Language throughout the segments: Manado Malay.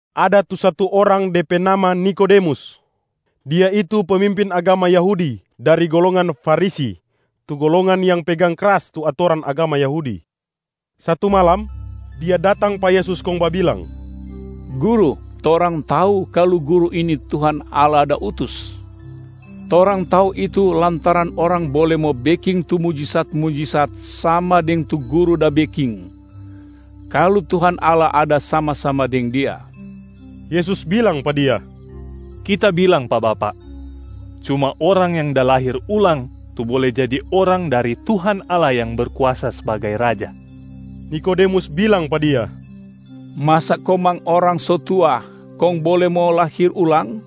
Ada tu satu orang de pe nama Nikodemus. Dia itu pemimpin agama Yahudi dari golongan Farisi tu golongan yang pegang kras tu atoran agama Yahudi. Satu malam, dia datang pa Yesus kong babilang, “Guru, torang tau kalu Guru ini Tuhan Allah da utus. Torang tau itu lantaran orang bole mo beking tu mujisat-mujisat sama deng tu Guru da beking, kalu Tuhan Allah ada sama-sama deng dia.” Yesus bilang pa dia, “Kita bilang pa bapak, cuma orang yang da lahir ulang tu bole jadi orang dari Tuhan Allah yang Berkuasa sbagai Raja.” Nikodemus bilang pa Dia, “Masa komang orang so tua kong bole mo lahir ulang?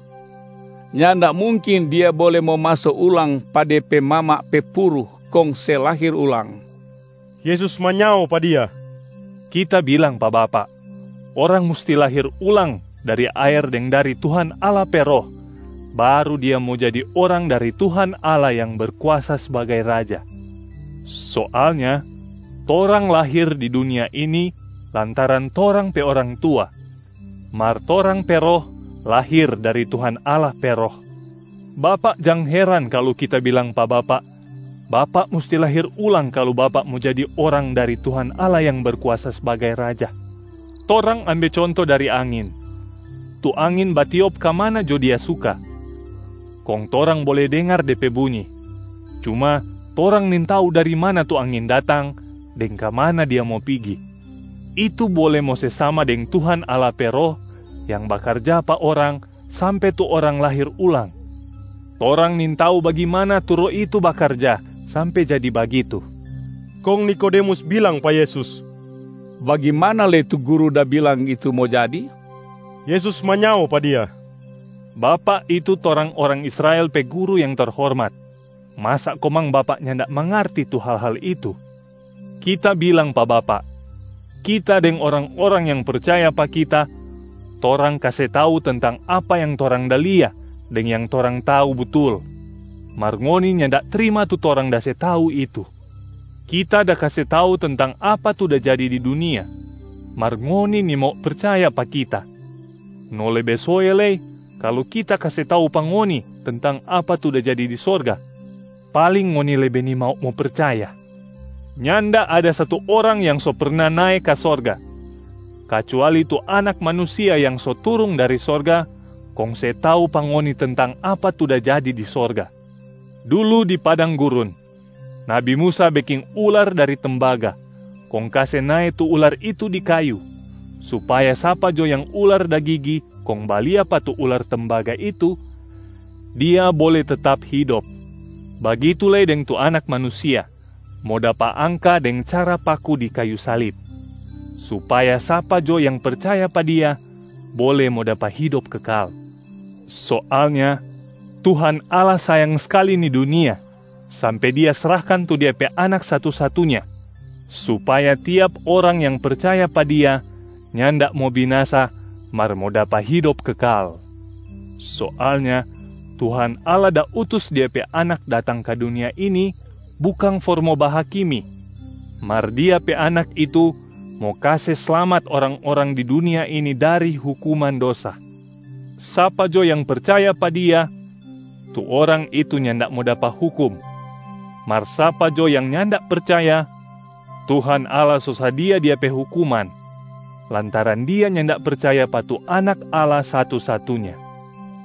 Nyanda mungkin dia bole mo maso ulang pa de pe mama pe puru kong se lahir ulang.” Yesus manyao pa dia, “Kita bilang pa bapak, orang musti lahir ulang dari aer deng dari Tuhan Allah pe Roh, baru dia mo jadi orang dari Tuhan Allah yang Berkuasa sbagai Raja. Soalnya torang lahir di dunia ini lantaran torang pe orang tua, mar torang pe roh lahir dari Tuhan Allah pe Roh. Bapak jang heran kalu Kita bilang pa bapak, ‘Bapak musti lahir ulang kalu bapak mo jadi orang dari Tuhan Allah yang Berkuasa sbagai Raja.’ Torang ambe conto dari angin: tu angin batiop ka mana jo dia suka, kong torang bole dengar de pe bunyi, cuma torang nintau dari mana tu angin datang deng ka mana dia mo pigi. Itu bole mo se sama deng Tuhan Allah pe Roh yang bakarja pa orang sampe tu orang lahir ulang, torang nintau bagimana tu Roh itu bakarja sampe jadi bagitu.” Kong Nikodemus bilang pa Yesus, “Bagimana lei tu Guru da bilang itu mo jadi?” Yesus manyao pa dia, “Bapak itu torang orang Israel pe guru yang terhormat, masa komang bapak nyanda mangarti tu hal-hal itu? Kita bilang pa bapak, Kita deng orang-orang yang percaya pa Kita, torang kase tau tentang apa yang torang da lia deng yang torang tau butul, mar ngoni nyanda trima tu torang da se tau itu. Kita da kase tau tentang apa tu da jadi di dunia, mar ngoni nimau percaya pa Kita, no lebe soe lei kalu Kita kase tau pa ngoni tentang apa tu da jadi di sorga, paling ngoni lebe nimau mo percaya. Nyanda ada satu orang yang so perna nae ka sorga, kacuali tu Anak Manusia yang so turung dari sorga kong se tau pa ngoni tentang apa tu da jadi di sorga. Dulu di padang gurun, nabi Musa beking ular dari tembaga kong kase nae tu ular itu di kayu supaya sapa jo yang ular da gigi kong balia pa tu ular tembaga itu, dia bole tetap hidop. Bagitu lei deng tu Anak Manusia mo dapa angka deng cara paku di kayu salib,a supaya sapa jo yang percaya pa Dia bole mo dapa hidop kekal. Soalnya Tuhan Allah sayang skali ni dunia sampe Dia srahkan tu Dia pe Anak satu-satunya, supaya tiap orang yang percaya pa Dia nyanda mo binasa mar mo dapa hidop kekal. Soalnya Tuhan Allah da utus Dia pe Anak datang ka dunia ini bukang for mo bahakimi, mar Dia pe Anak itu mo kase slamat orang-orang di dunia ini dari hukuman dosa. Sapa jo yang percaya pa Dia, tu orang itu nyanda mo dapa hukum. Mar sapa jo yang nyanda percaya, Tuhan Allah so sadia dia pe hukuman, lantaran dia nyanda percaya pa tu Anak Allah satu-satunya.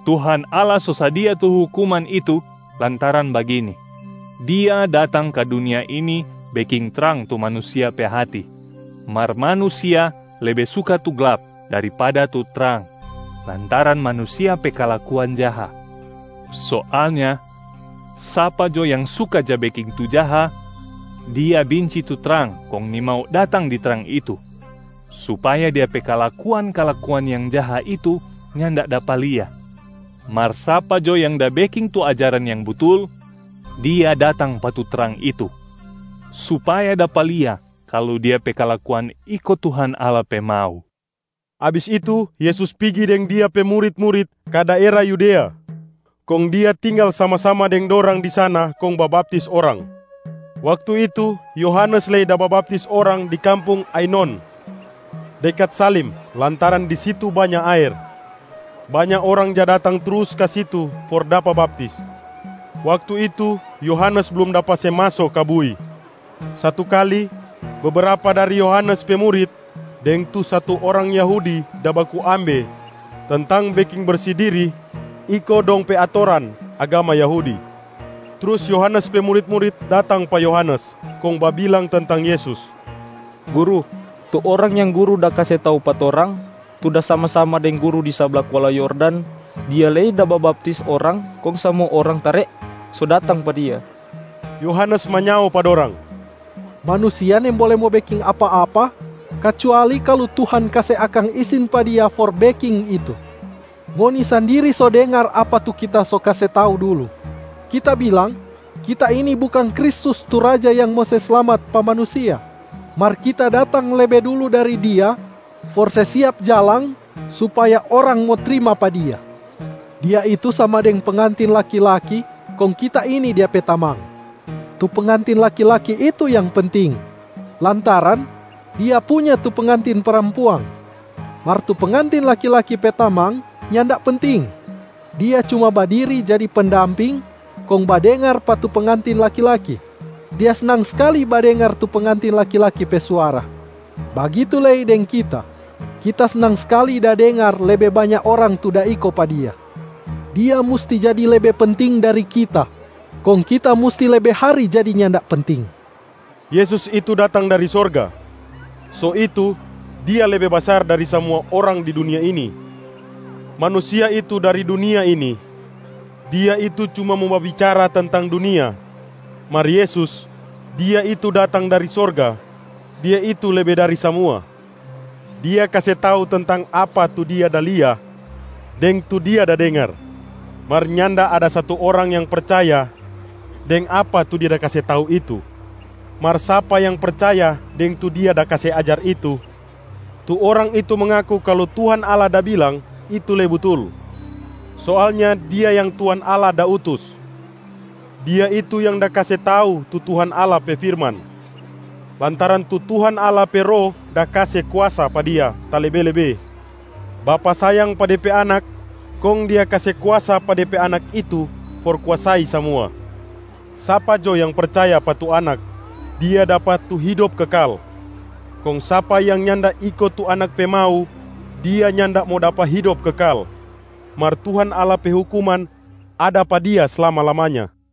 Tuhan Allah so sadia tu hukuman itu lantaran bagini: Dia datang ka dunia ini beking trang tu manusia pe hati, mar manusia lebe suka tu glap daripada tu trang lantaran manusia pe kalakuan jaha. Soalnya, sapa jo yang suka ja beking tu jaha, dia binci tu trang kong nimau datang di trang itu, supaya dia pe kalakuan-kalakuan yang jaha itu nyanda dapa lia. Mar sapa jo yang da beking tu ajaran yang butul, dia datang pa tu trang itu, supaya dapa lia kalu dia pe kalakuan iko Tuhan Allah pe mau.” Abis itu, Yesus pigi deng Dia pe murit-murit ka daera Yudea, kong Dia tinggal sama-sama deng dorang di sana kong babaptis orang. Waktu itu, Yohanes lei da babaptis orang di kampung Ainon, dekat Salim, lantaran di situ banya aer. Banya orang ja datang trus ka situ for dapa baptis. (Waktu itu Yohanes blum dapa se maso ka bui). Satu kali, bebrapa dari Yohanes pe murit deng tu satu orang Yahudi da baku ambe tentang beking bersi dirib iko dong pe atoran agama Yahudi. Trus Yohanes pe murit-murit datang pa Yohanes kong babilang tentang Yesus, “Guru, tu Orang yang guru da kase tau pa torang, tu da sama-sama deng guru di sabla kuala Yordan, Dia lei da babaptis orang kong samua orang tare so datang pa Dia.” Yohanes manyao pa dorang, “Manusia nimbole mo beking apa-apa kacuali kalu Tuhan kase akang isin pa dia for beking itu. Ngoni sandiri so dengar apa tu kita so kase tau dulu. Kita bilang, kita ini bukang Kristus tu Raja yang mo se slamat pa manusia, mar kita datang lebe dulu dari Dia for se siap jalang supaya orang mo trima pa Dia. Dia itu sama deng pengantin laki-laki kong kita ini Dia pe tamang. Tu pengantin laki-laki itu yang penting lantaran dia punya tu pengantin parampuang. Mar tu pengantin laki-laki pe tamang nyanda penting, dia cuma badiri jadi pendamping kong badengar pa tu pengantin laki-laki. Dia snang skali badengar tu pengantin laki-laki pe suara. Bagitu lei deng kita, kita snang skali da dengar lebe banya orang tu da iko pa Dia. Dia musti jadi lebe penting dari kita, kong kita musti lebe hari jadi nyanda penting.” Yesus itu datang dari sorga, so itu Dia lebe basar dari samua orang di dunia ini. Manusia itu dari dunia ini, dia itu cuma mo babicara tentang dunia. Mar Yesus, Dia itu datang dari sorga, Dia itu lebe dari samua. Dia kase tau tentang apa tu Dia da lia deng tu Dia da dengar, mar nyanda ada satu orang yang percaya deng apa tu Dia da kase tau itu. Mar sapa yang percaya deng tu Dia da kase ajar itu, tu orang itu mangaku kalu Tuhan Allah da bilang itu lei butul. Soalnya Dia yang Tuhan Allah da utus, Dia itu yang da kase tau tu Tuhan Allah pe firman, lantaran tu Tuhan Allah pe Roh da kase kuasa pa Dia talebe-lebe. Bapa sayang pa Dia pe Anak kong Dia kase kuasa pa Dia pe Anak itu for kuasai samua. Sapa jo yang percaya pa tu Anak, dia dapa tu hidop kekal, kong sapa yang nyanda iko tu Anak pe mau, dia nyanda mo dapa hidop kekal, mar Tuhan Allah pe hukuman ada pa dia slama-lamanya.